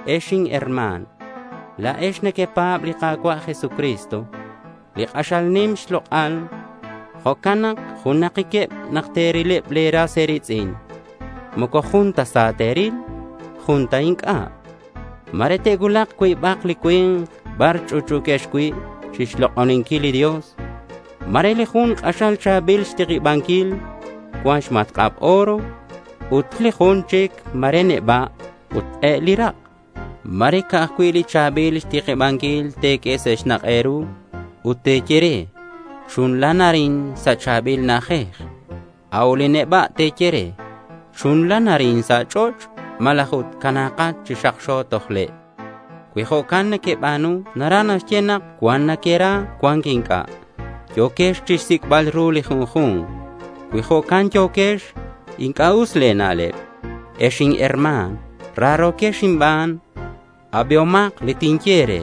Ex inherma̱n, la̱ex nequepa̱b li Ka̱cua' Jesucristo, li k'axal nim xlok'al. Jo'can nak junakiqueb nak te̱rileb le̱ ras e̱ri̱tz'in. Moco jun ta sa te̱ril ut jun ta inc'a'. Ma̱re te'cuulak cuibak li cui̱nk bar ch'utch'u̱quex cui' chixlok'oninquil li Dios. Ma̱re li jun k'axal cha̱bil xtikibanquil ut cuan xmatk'ab oro. Ut li jun chic ma̱re neba' ut k'el li rak'. Ma̱re ca'aj cui' li cha̱bil xtikibanquil te̱q'ue sa' xnak' e̱ru ut te̱ye re: Chunlan arin sa' li cha̱bil na'ajej. A'ut li neba' te̱ye re: Chunlan arin sa' ch'och' malaj ut cana̱kat chi xakxo toj le'. Cui jo'can nequeba̱nu naraj naxye nak cuan nequera ut cuan inc'a'. Yo̱quex chixsic'bal ru li junju̱nk. Cui jo'can yo̱quex, inc'a' us le̱ na'leb. Ex inherma̱n, raro̱quex inban. Abihomak li tinye e̱re.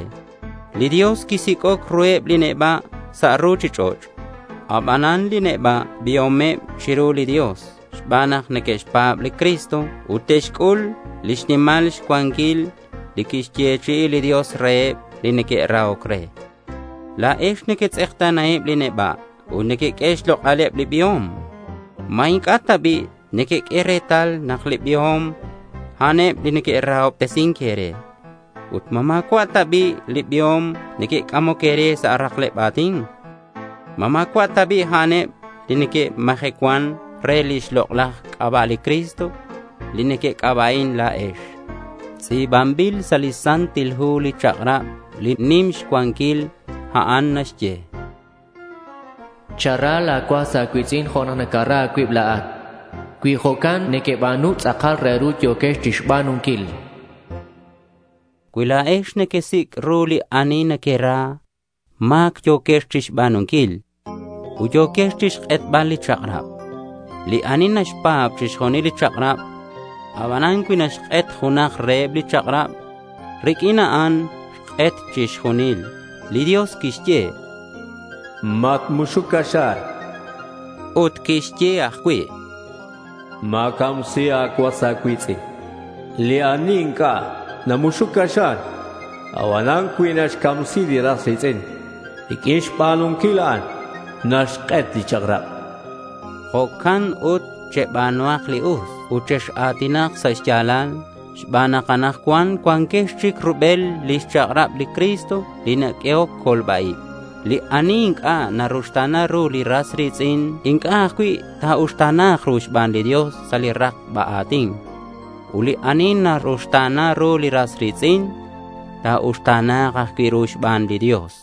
Li Dios quisic'oc ruheb li neba' sa' ruchich'och'. Abanan li neba' biomeb chiru li Dios xban nak neque'xpa̱b li Cristo ut te'xc'ul lix nimal xcuanquil li quixyechi'i li Dios reheb li neque'rahoc re. La̱ex nequetz'ekta̱naheb li neba' ut nequeq'ue xlok'aleb li biom. ¿Ma inc'a' ta bi' nequeq'ue retal nak li biom, a'aneb li neque'rahobtesin e̱re? Ut ¿ma ma̱cua'eb ta bi' li biom li neque'c'amoc e̱re sa' rakleb a̱tin? ¿Ma ma̱cua' ta bi' a'aneb li neque'majecuan re lix lok'laj c'aba' li Cristo, li nequec'aba'in la̱ex? Tz'i̱banbil sa' li Santil Hu li chak'rab li k'axal nim xcuanquil. A'an naxye: Chara la̱ cuas a̱cui̱tz'in jo' nak nacara a̱cuib la̱at. Cui jo'can nequeba̱nu tz'akal re ru yo̱quex chixba̱nunquil. Cui la̱ex nequesic' ru li ani nequera, ma̱c yo̱quex chixba̱nunquil. Ut yo̱quex chixk'etbal li chak'rab. Li ani naxpa̱b chixjunil li chak'rab, abanan cui naxk'et junak reheb li chak'rab, riq'uin a'an xk'et chixjunil. Li Dios quixye: Matmuxuc caxa̱r. Ut quixye ajcui': Ma̱camsi a̱cuas a̱cui̱tz'in. Li ani inc'a' namuxuc caxa̱r, abanan cui xcamsi li ras ri̱tz'in, riq'uin xba̱nunquil a'an, naxk'et li chak'rab. Jo'can ut cheba̱nuhak li us ut chex-a̱tinak sa' xya̱lal xban nak anakcuan cuanquex chic rubel lix chak'rab li Cristo li naq'uehoc colba-ib. Li ani inc'a' naruxta̱na ru li ras ri̱tz'in inc'a' ajcui' ta̱uxta̱na̱k ru xban li Dios sa' li rakba a̱tin. Ut li ani ta̱ruxta̱na ru li ras ri̱tz'in, ta̱uxta̱na̱k ajcui' ru xban li Dios.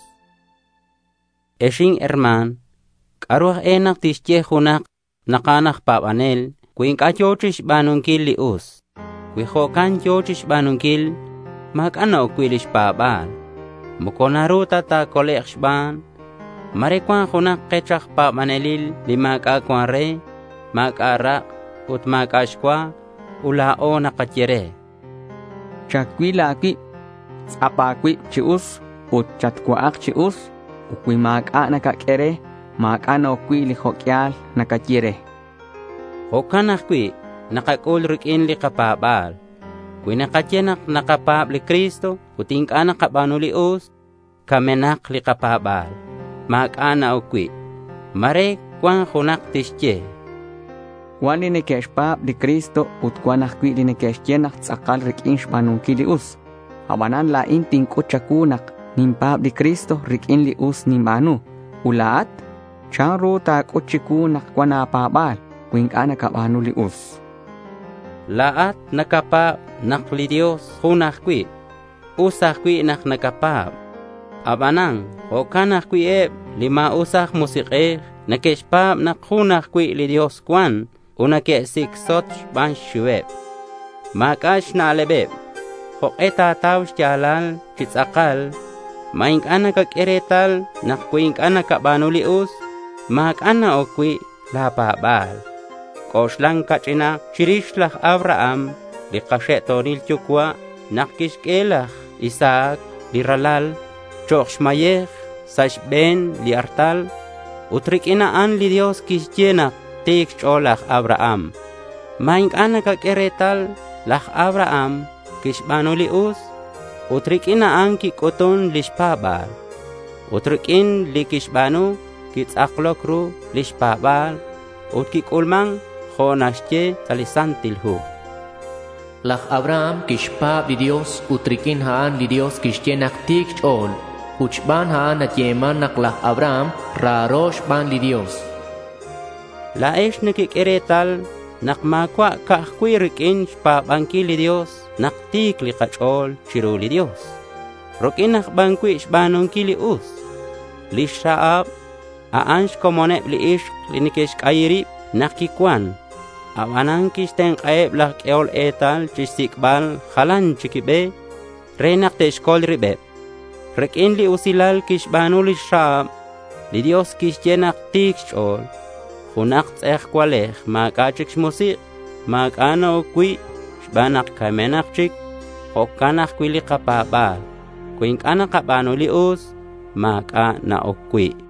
Ex inherma̱n, ¿c'a'ru aj e nak tixye junak nak a'an aj pa̱banel cui inc'a' yo̱ chixba̱nunquil li us? Cui jo'can yo̱ chixba̱nunquil, ma̱c'a' na-oc cui' lix pa̱ba̱l. Moco naru ta ta̱colek' xban. Ma̱re cuan junak kech aj pa̱banelil ma̱c'a' cuan re. Ma̱c'a' rak' ut ma̱c'a' xcua. Ut la̱o nakaye re: Chacuil a̱cuib. Tz'ap a̱cuib chi us ut chatcua'ak chi us. Ut cui ma̱c'a' nakaq'ue re, ma̱c'a' na-oc cui' li jo' q'uial nakaye re. Jo'can ajcui' nakac'ul riq'uin li kapa̱ba̱l. Cui nakaye nak nakapa̱b li Cristo ut inc'a' nakaba̱nu li us, camenak li kapa̱ba̱l. Ma̱c'a' na-oc cui'. Ma̱re cuan junak tixye: Cuan li neque'xpa̱b li Cristo ut cuan ajcui' li neque'xye nak tz'akal riq'uin xba̱nunquil li us. Abanan la̱in tinc'ut cha̱cuu nak ninpa̱b li Cristo riq'uin li us ninba̱nu. Ut la̱at, ¿chanru nak ta̱c'ut chicuu nak cuan a̱pa̱ba̱l cui inc'a' nacaba̱nu li us? La̱at nacapa̱b nak li Dios jun ajcui'. Us ajcui' nak nacapa̱b. Aban jo'can ajcui' eb li ma̱us aj musik'ej neque'xpa̱b nak jun ajcui' li Dios cuan ut neque'sicsot xban xxiuheb. Ma̱c'a' a̱na'leb. ¿Jok'e ta̱tau xya̱lal chi tz'akal? ¿Ma inc'a' nacaq'ue retal nak cui inc'a' nacaba̱nu li us, ma̱c'a' na-oc cui' la̱ pa̱ba̱l? C'oxlan ca'ch'inak chirix laj Abraham li kaxe'to̱nil yucua' nak quixq'ue laj Isaac li ralal chok' xmayej sa' xbe̱n li artal. Ut riq'uin a'an li Dios quixye nak ti̱c xch'o̱l laj Abraham. ¿Ma inc'a' nacaq'ue retal nak laj Abraham quixba̱nu li us ut riq'uin a'an quic'utun lix pa̱ba̱l? Ut riq'uin li quixba̱nu quitz'akloc ru lix pa̱ba̱l. Ut quic'ulman jo' naxye sa' li Santil Hu: Laj Abraham quixpa̱b li Dios ut riq'uin a'an li Dios quixye nak ti̱c xch'o̱l. Ut xban a'an nayeman nak laj Abraham raro xban li Dios. La̱ex nequeq'ue retal nak ma̱cua' ca'aj cui' riq'uin xpa̱banquil li Dios nak ti̱c li kach'o̱l chiru li Dios. Riq'uin aj ban cui' xba̱nunquil li us. Lix Rahab, a'an xcomoneb li ixk li neque'xc'ayi rib nak quicuan. Abanan quixtenk'aheb laj q'uehol etal chixsic'bal jalan chic be re nak te'xcol ribeb. Riq'uin li usilal quixba̱nu lix Rahab, li Dios quixye nak ti̱c xch'o̱l. Junak tz'ejcualej ma̱c'a' chic xmusik', ma̱c'a' na-oc cui' xban nak camenak chic. Jo'can ajcui' li kapa̱ba̱l. Cui inc'a' nakaba̱nu li us, ma̱c'a' na-oc cui'.